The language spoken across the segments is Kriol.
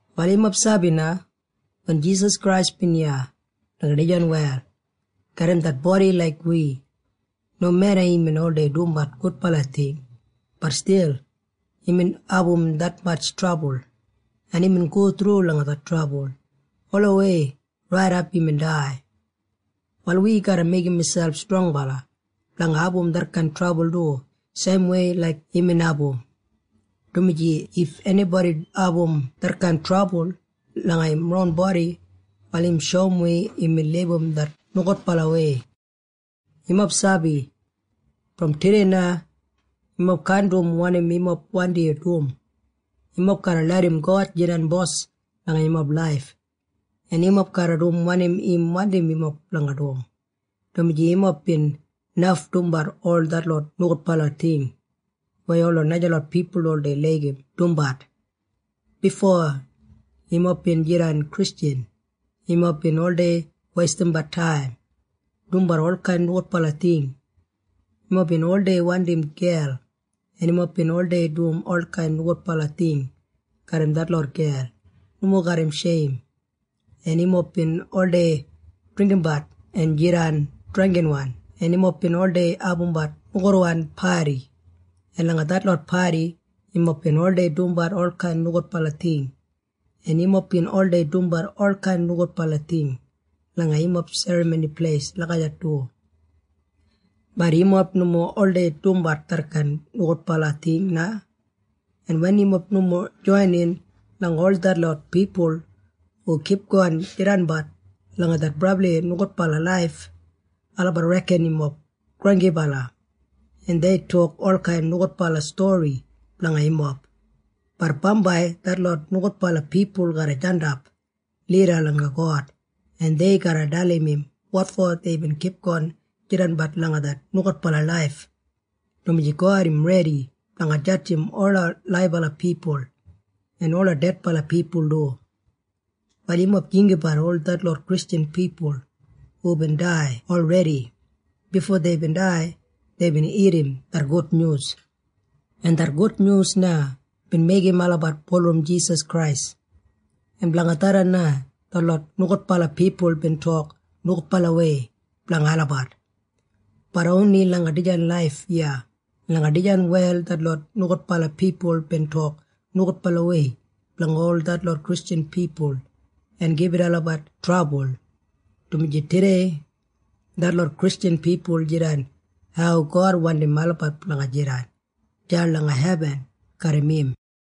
Wal yumob sabi na? Wen Jisas Krais bin iya langa dijan wel garram det bodi laik wi, nomeda imbin oldei dumbat gudbala ting, bat stil imbin abum detmatj trabul, en imbin go thru langa det trabul olawei raidap imbin dai. Wal wi garra meigim miselp strongbala blanga abum detkain trabul du seimwei laik imbin abum, dumaji if enibodi abum detkain trabul langa im ron bodi, wal im shoum wi imbin libum det nogudbalawei. Yumob sabi? Brom tudei na yumob kaan dum wanim yumob wandi dum. Yumob garra larram God jidan Bos langa yumob laif, en yumob garra dum wanim im wandim yumob blanga dum, dumaji yumob bin naf dumbat ol detlot nogudbala ting weya ola najalot pipul oldei laigim dumbat. Bifo yumob bin jidan Kristjan yumob bin oldei weistimbat taim dumbat olkain nogudbala ting. Yumob bin oldei wandim gel, en yumob bin oldei dum olkain nogudbala ting garram detlot gel nomo garram sheim, en yumob bin oldei dringgimbat en jidan drangginwan, en yumob bin oldei abumbat nogudwan padi, en langa detlot padi yumob bin oldei dumbat olkain nogudbala ting, en yumob bin oldei dumbat olkain nogudbala ting langa yumob serramoni pleis lagijat du. Bat yumob nomo oldei dumbat detkain nogudbala ting na, en wen yumob nomo joinin langa ol detlot pipul hu kipgon jidanbat langa det brabli nogudbala laif, olabat reken yumob granggibala, en dei tok olkain nogudbala stori blanga yumob. Bat bambai detlot nogudbala pipul garra jandap lida langa God, en dei garra dalim im wotfo deibin kipgon jidanbat langa det nogudbala laif, dumaji God im redi blanga jadjim ola laibala pipul en ola dedbala pipul du. Wal yumob jinggabat ol detlot Kristjan pipul hubin dai olredi. Bifo deibin dai, deibin irrim det gudnyus, en det gudnyus na bin meigim olabat bulurrum Jisas Krais, en blanga tharran na detlot nogudbala pipul bin tok nogudbalawei blanga olabat. Bat oni langa dijan laif iya langa dijan wel detlot nogudbala pipul bin tok nogudbalawei blanga detlot Kristjan pipul en gibit olabat trabul, dumaji tudei detlot Kristjan pipul jidan hau God wandim olabat blanga jidan deya langa hebin garram im.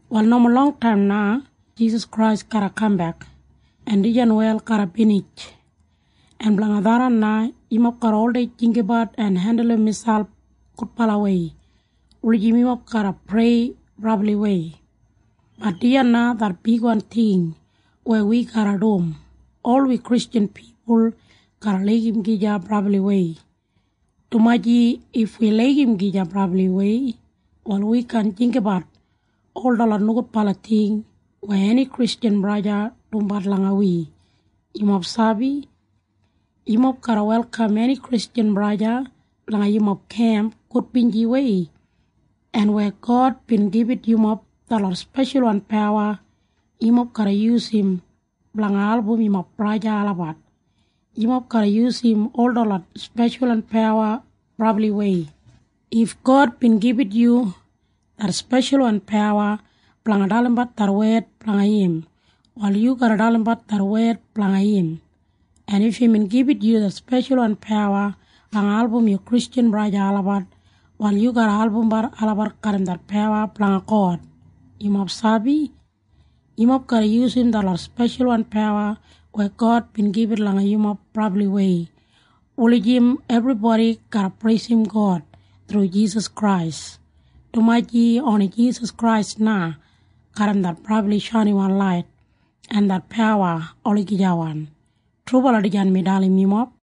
Wal nomo longtaim na Jisas Krais garra kambek en dijan wel garra binij. En blanga tharran na yumob garra oldei jinggabat en hendulum miselp gudbalawei wulijim yumob garra prei brabliwei. Bat dijan na det bigwan ting weya wi garra dum. Ol wi Kristjan pipul garra laigim gija brabliwei, dumaji if wi laigim gija brabliwei, wal wi kaan jinggabat ol detlot nogudbala ting weya eni Kristjan braja o sista dumbat langa wi. Yumob sabi? Yumob garra welkam eni Kristjan braja o sista langa yumob kemp gudbinjiwei. En weya God bin gibit yumob detlot speshalwan pawa, yumob garra yusum blanga album yumob braja en sista olabat. Yumob garra yusum ol detlot speshalwan pawa brabliwei. If God bin gibit yu det speshalwan pawa blanga dalimbat det wed blanga im, wal yu garra dalimbat det wed blanga im. En if imbin gibit yu det speshalwan pawa blanga album yu Kristjan braja en sista olabat, wal yu garra albumbat olabat garram det pawa blanga God. Yumob sabi? Yumob garra yusum detlot speshalwan pawa weya God bin gibit langa yumob brabliwei wulijim ebribodi garra preisim God thru Jisas Krais, dumaji oni Jisas Krais na garram det brabli shainiwan lait en det pawa olagijawan. Trubala dijan mi dalim yumob.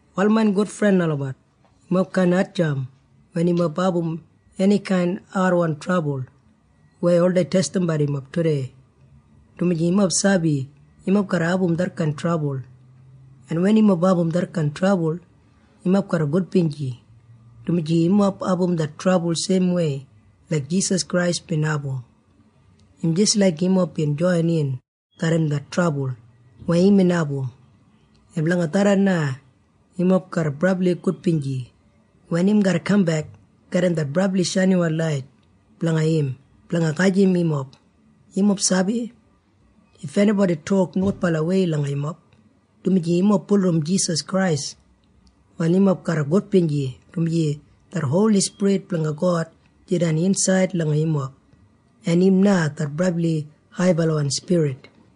Wal main gudfren olabat, yumob kaan hatjamp wen yumob abum enikain adwan trabul weya oldei testimbat yumob tudei, dumaji yumob sabi yumob garra abum detkain trabul. En wen yumob abum detkain trabul, yumob garra gudbinji, dumaji yumob abum det trabul seimwei laik Jisas Krais bin abum. Im jis laik yumob bin joinin garram det trabul weya imbin abum, en blanga tharran na yumob garra brabli gudbinji wen im garra kambek garram det brabli shainiwan lait blanga im blanga gajim yumob. Yumob sabi? If enibodi tok nogudbalawei langa yumob, dumaji yumob bulurrum Jisas Krais, wal yumob garra gudbinji, dumaji det Holi Spirit blanga God jidan insaid langa yumob, en im na det brabli haibalawan Spirit.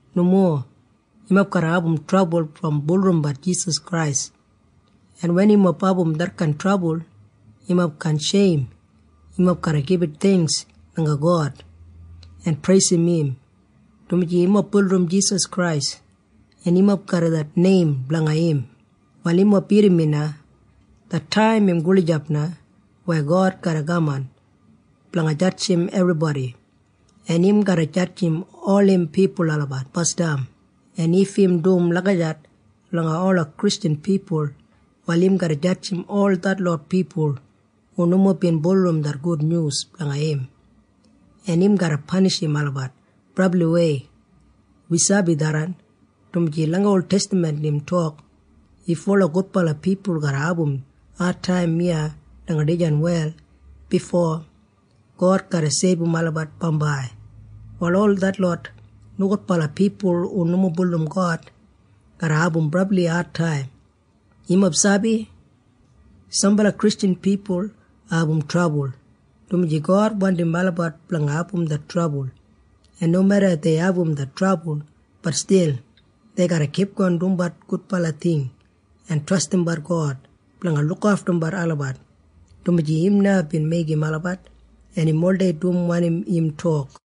Nomo. Yumob garra abum trabul brom bulurrumbat Jisas Krais, en wen yumob abum detkain trabul, yumob kaan sheim. Yumob garra gibit theingks langa God en preisim im, dumaji yumob bulurrum Jisas Krais, en yumob garram det neim blanga im. Wal yumob irrim mi na. Det taim im gulijap na weya God garra kaman blanga jadjim ebribodi, en im garra jadjim ol im pipul olabat basdam. En if im dum lagijat langa ola Kristjan pipul, wal im garra jadjim ol detlot pipul hu nomo bin bulurrum det gudnyus blanga im, en im garra panishim olabat brabliwei. Wi sabi tharran, dumaji langa oltestaman im tok, “If ola gudbala pipul garra abum adtaim iya langa dijan wel bifo God garra seibum olabat bambai, wal ol detlot nogudbala pipul hu nomo bulurrum God garra abum brabli adtaim.” Yumob sabi? Sambala Kristjan pipul abum trabul, dumaji God wandim olabat blanga abum det trabul. En nomeda dei abum det trabul, bat stil dei garra kipgon dumbat gudbala ting en trastimbat God blanga lukaftumbat olabat, dumaji im na bin meigim olabat, en im oldei dum wanim im tok.